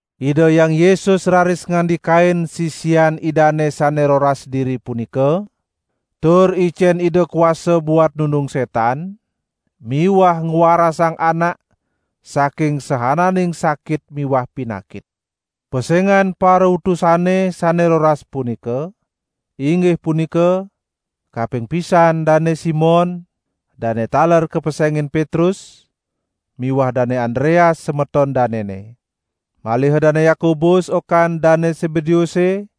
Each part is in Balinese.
Ida Hyang Yesus raris ngandikain sisian Idane sane roras diri punika, tur icen Ida kuasa buat nundung setan miwah ngwarasang anak saking saananing sakit miwah pinakit. Pesengan parautusane sane roras punika, inggih punika: Kaping pisan Dane Simon (dane taler kapesengin Petrus) miwah Dane Andreas semeton danene. Maliha Dane Yakobus okan Dane Sebedeuse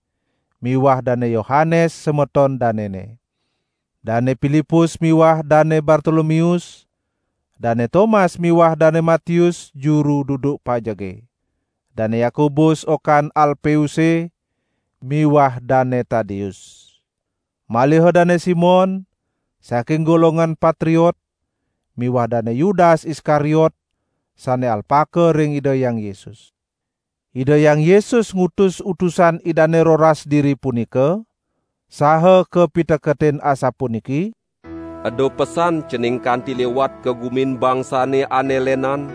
miwah Dane Yohanes semeton danene. Dane Pilipus miwah Dane Bartolomeus, Dane Tomas miwah Dane Matius juru duduk pajege, Dane Yakobus okan Alpeuse miwah Dane Tadeus. Maliha Dane Simon (saking golongan Patriot) miwah Dane Yudas Iskariot sane alpaka ring Ida Hyang Yesus. Ida Hyang Yesus ngutus utusan Idane roras diri punika saha kapiteketin asapuniki: "Eda pesan cening kanti liwat ka gumin bangsane ane lenan,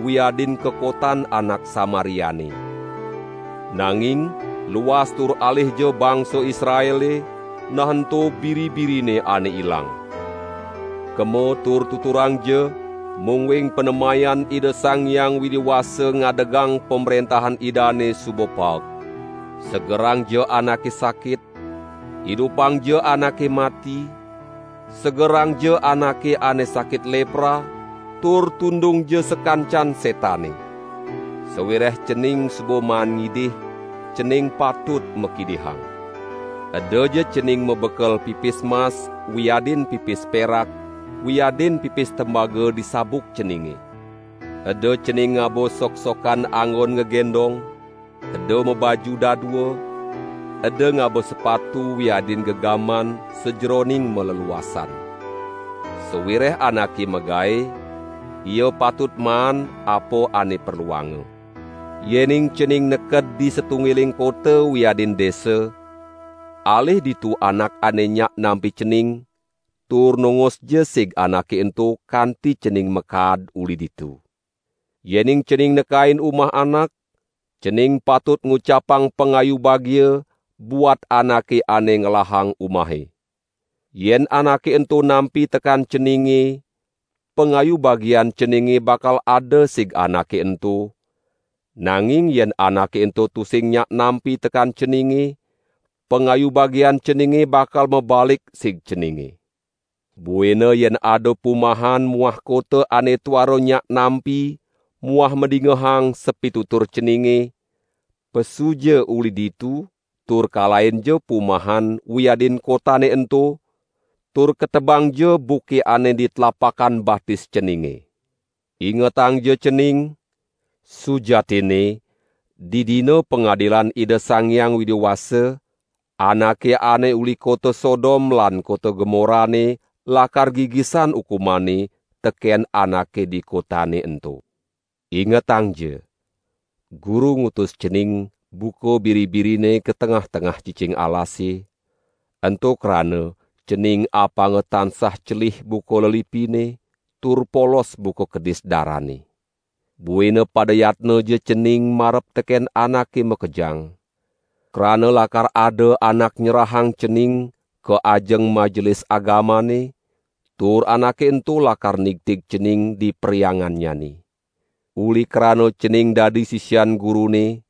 wiadin ka kotan anak Samariane. Nanging luas tur alihja bangsa Israele, nah ento biri-birine ane ilang. Kema tur tuturangja, mungguing panemayan Ida Sang Hyang Widi Wasa ngadegang Pamrentahan Idane suba paek. Segerangja anake sakit, idupangja anake mati, segerangja anake ane sakit lepra, tur tundungja sakancan setane. Sawireh cening suba maan ngidih, cening patut makidihang. Edaja cening mabekel pipis mas wiadin pipis perak wiadin pipis temaga di sabuk ceninge. Eda cening ngaba soksokan anggon ngagendong, eda mabaju dadua, eda ngaba sepatu wiadin gegaman sajeroning maleluasan. Sawireh anake magae ia patut maan apa ane perluanga. Yening cening neked di satunggiling kota wiadin desa, alih ditu anak ane nyak nampi cening, tur nongosja sig anake ento kanti cening makaad uli ditu. Yening cening nekain umah anak, cening patut ngucapang pangayu bagia buat anake ane ngelahang umahe. Yen anake ento nampi tekan ceninge, pangayu bagian ceninge bakal ada sig anake ento, nanging yen anake ento tusing nyak nampi tekan ceninge, pangayu bagian ceninge bakal mabalik sig ceninge. Buina yen ada pumahan muah kota ane tuara nyak nampi muah madingehang sapitutur ceninge, pesuja uli ditu tur kalahinja pumahan wiadin kotane ento, tur ketebangja buke ane di tlapakan batis ceninge. Ingetangja cening, sujatinne di Dina Pangadilane Ida Sang Hyang Widi Wasa, anake ane uli kota Sodom lan kota Gomorane lakar gigisan ukumane teken anake di kotane ento." "Ingetangja, Guru ngutus cening buka biri-birine ka tengah-tengah cicing alasane, ento krana cening apanga tansah celih buka lelipine tur polos buka kedis darane. Buina pada yatnaja cening marep teken anake makejang; krana lakar ada anak nyerahang cening ka ajeng Majelis Agamane, tur anake ento lakar nigtig cening di perhyangannyane. Uli krana cening dadi sisian Gurune,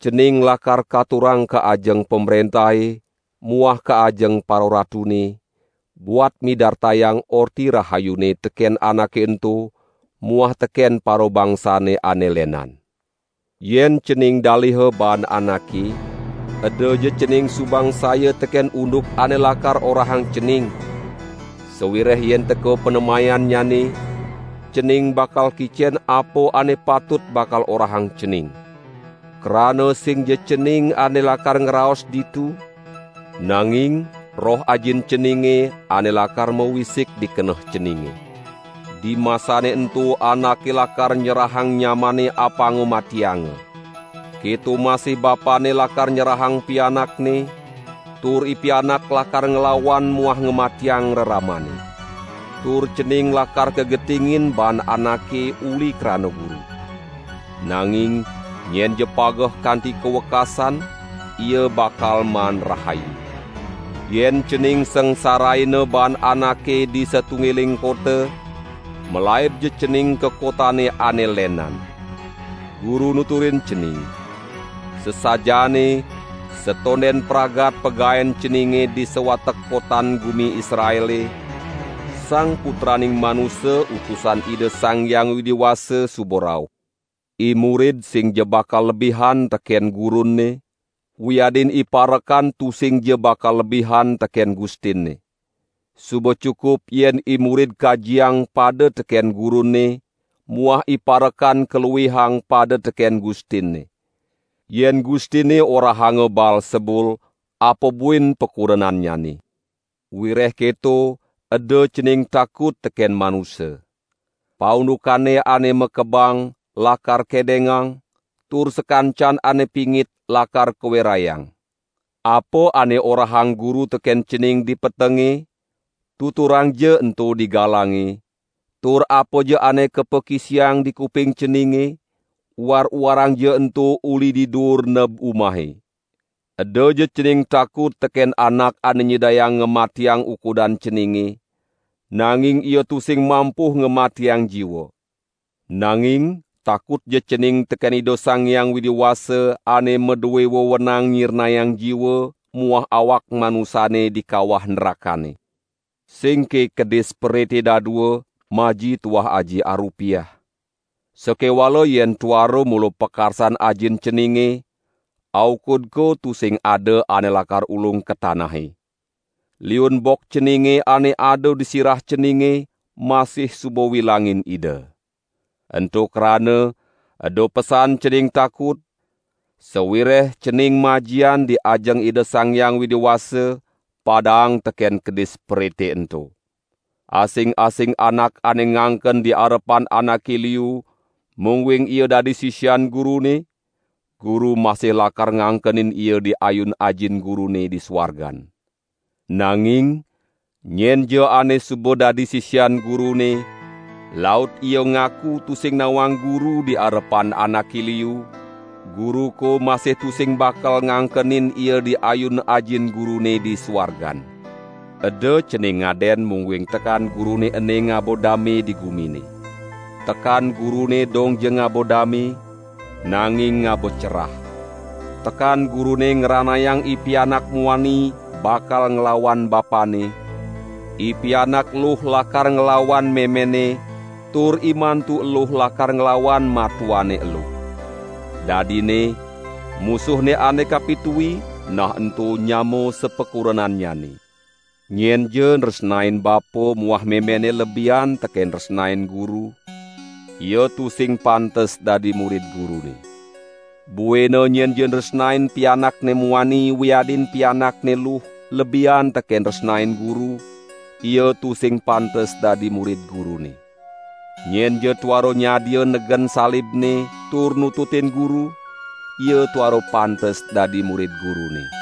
cening lakar katurang ka ajeng pamrentahe muah ka ajeng pararatune, buat midartayang Orta Rahayune teken anake ento muah teken parabangsane ane lenan. Yen cening daliha baan anake, edaja cening sumangsaya teken unduk ane lakar orahang cening; sawireh yen teka panemayannyane, cening bakal kicen apa ane patut bakal orahang cening! Krana singja cening ane lakar ngraos ditu, nanging Roh Ajin ceninge ane lakar mawisik di keneh ceninge. Dimasane ento anake lakar nyerahang nyamanne apanga matianga. Keto masih bapanne lakar nyerahang pianakne, tur ipianak lakar nglawan muah ngamatiang reramanne. Tur cening lakar kagetingin baan anake uli krana Guru. Nanging nyenja pageh kanti ka wekasan, ia bakal maan rahayu. Yen cening sangsaraina baan anake di satunggiling kota, malaibja cening ka kotane ane lenan. Guru nuturin cening: "Sasajaane satonden pragat pagaen ceninge di sawatek kotan gumi Israele, Sang Putraning Manusa Utusan Ida Sang Hyang Widi Wasa suba rauh. Imurid singja bakal lebihan teken gurunne, wiadin iparekan tusingja bakal lebihan teken gustinne. Suba cukup yen imurid kajiang pada teken gurunne muah iparekan kaluihang pada teken gustinne. Yen gustinne orahanga Baalsebul apa buin pakurenannyane!" "Wireh keto eda cening takut teken manusa. Paundukane ane makebang, lakar kedengang, tur sakancan ane pingit lakar kawerayang. Apa ane orahang Guru teken cening di petenge, tuturangja ento di galange tur apaja ane kapakisiang di kuping ceninge, uar-uarangja ento uli di duur neb umahe. Edaja cening takut teken anak ane nyidayang ngamatiang ukudan ceninge, nanging ia tusing mampuh ngamatiang jiwa. Nanging takutja cening teken Ida Sang Hyang Widi Wasa ane madue wewenang nyirnayang jiwa muah awak manusane di kawah nrakane. Singke kedis perite dadua maji tuah aji arupiah. Sakewala yen tuara mula pakarsan Ajin ceninge, aukud ko tusing ada ane lakar ulung ka tanahe. Liun bok ceninge ane ada di sirah ceninge masih suba wilangin Ida. Ento krana eda pesan cening takut, sawireh cening majian di ajeng Ida Sang Hyang Widi Wasa padaang teken kedis perite ento." "Asing-asing anak ane ngangken di arepan anake liu, mungguing ia dadi sisian Gurune, Guru masih lakar ngangkenin ia di ayun Ajin Gurune di suargan. Nanging nyenja ane suba dadi sisian Gurune, laut ia ngaku tusing nawang Guru di arepan anake liu, Guru ko masih tusing bakal ngangkenin ia di ayun Ajin Gurune di suargan." "Eda cening ngaden mungguing tekan Gurune ene ngaba dame di gumine. Tekan Gurune dongja ngaba dame, nanging ngaba cerah. Tekan Gurune ngranayang ipianak muani bakal nglawan bapanne, ipianak eluh lakar nglawan memenne, tur imantu eluh lakar nglawan matuanne eluh. Dadinne musuhne ane kapitui, nah ento nyama sapakurenannyane. Nyenja nresnain bapa muah memenne lebihan teken nresnain Guru, ia tusing pantes dadi murid Gurune. Buina nyenja nresnain pianakne muani wiadin pianakne eluh lebihan teken nresnain Guru, ia tusing pantes dadi murid Gurune. Nyenja tuara nyadia negen salibne tur nututin Guru, ia tuara pantes dadi murid Gurune.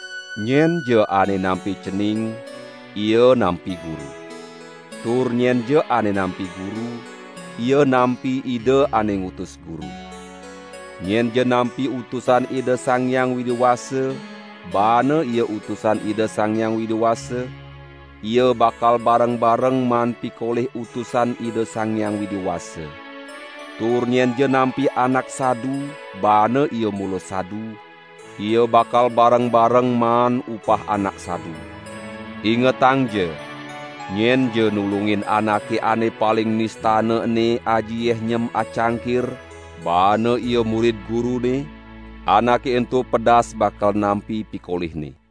"Nyenja ane nampi cening, ia nampi Guru. Tur nyenja ane nampi Guru, ia nampi Ida ane ngutus Guru. Nyenja nampi utusan Ida Sang Hyang Widi Wasa, baane ia utusan Ida Sang Hyang Widi Wasa, ia bakal bareng-bareng maan pikolih utusan Ida Sang Hyang Widi Wasa. Tur nyenja nampi anak sadu, baane ia mula sadu, ia bakal bareng-bareng maan upah anak sadu. Ingetangja! Nyenja nulungin anake ane paling nistana ene aji yeh nyem acangkir baane ia murid Gurune, anake ento pedas bakal nampi pikolihne."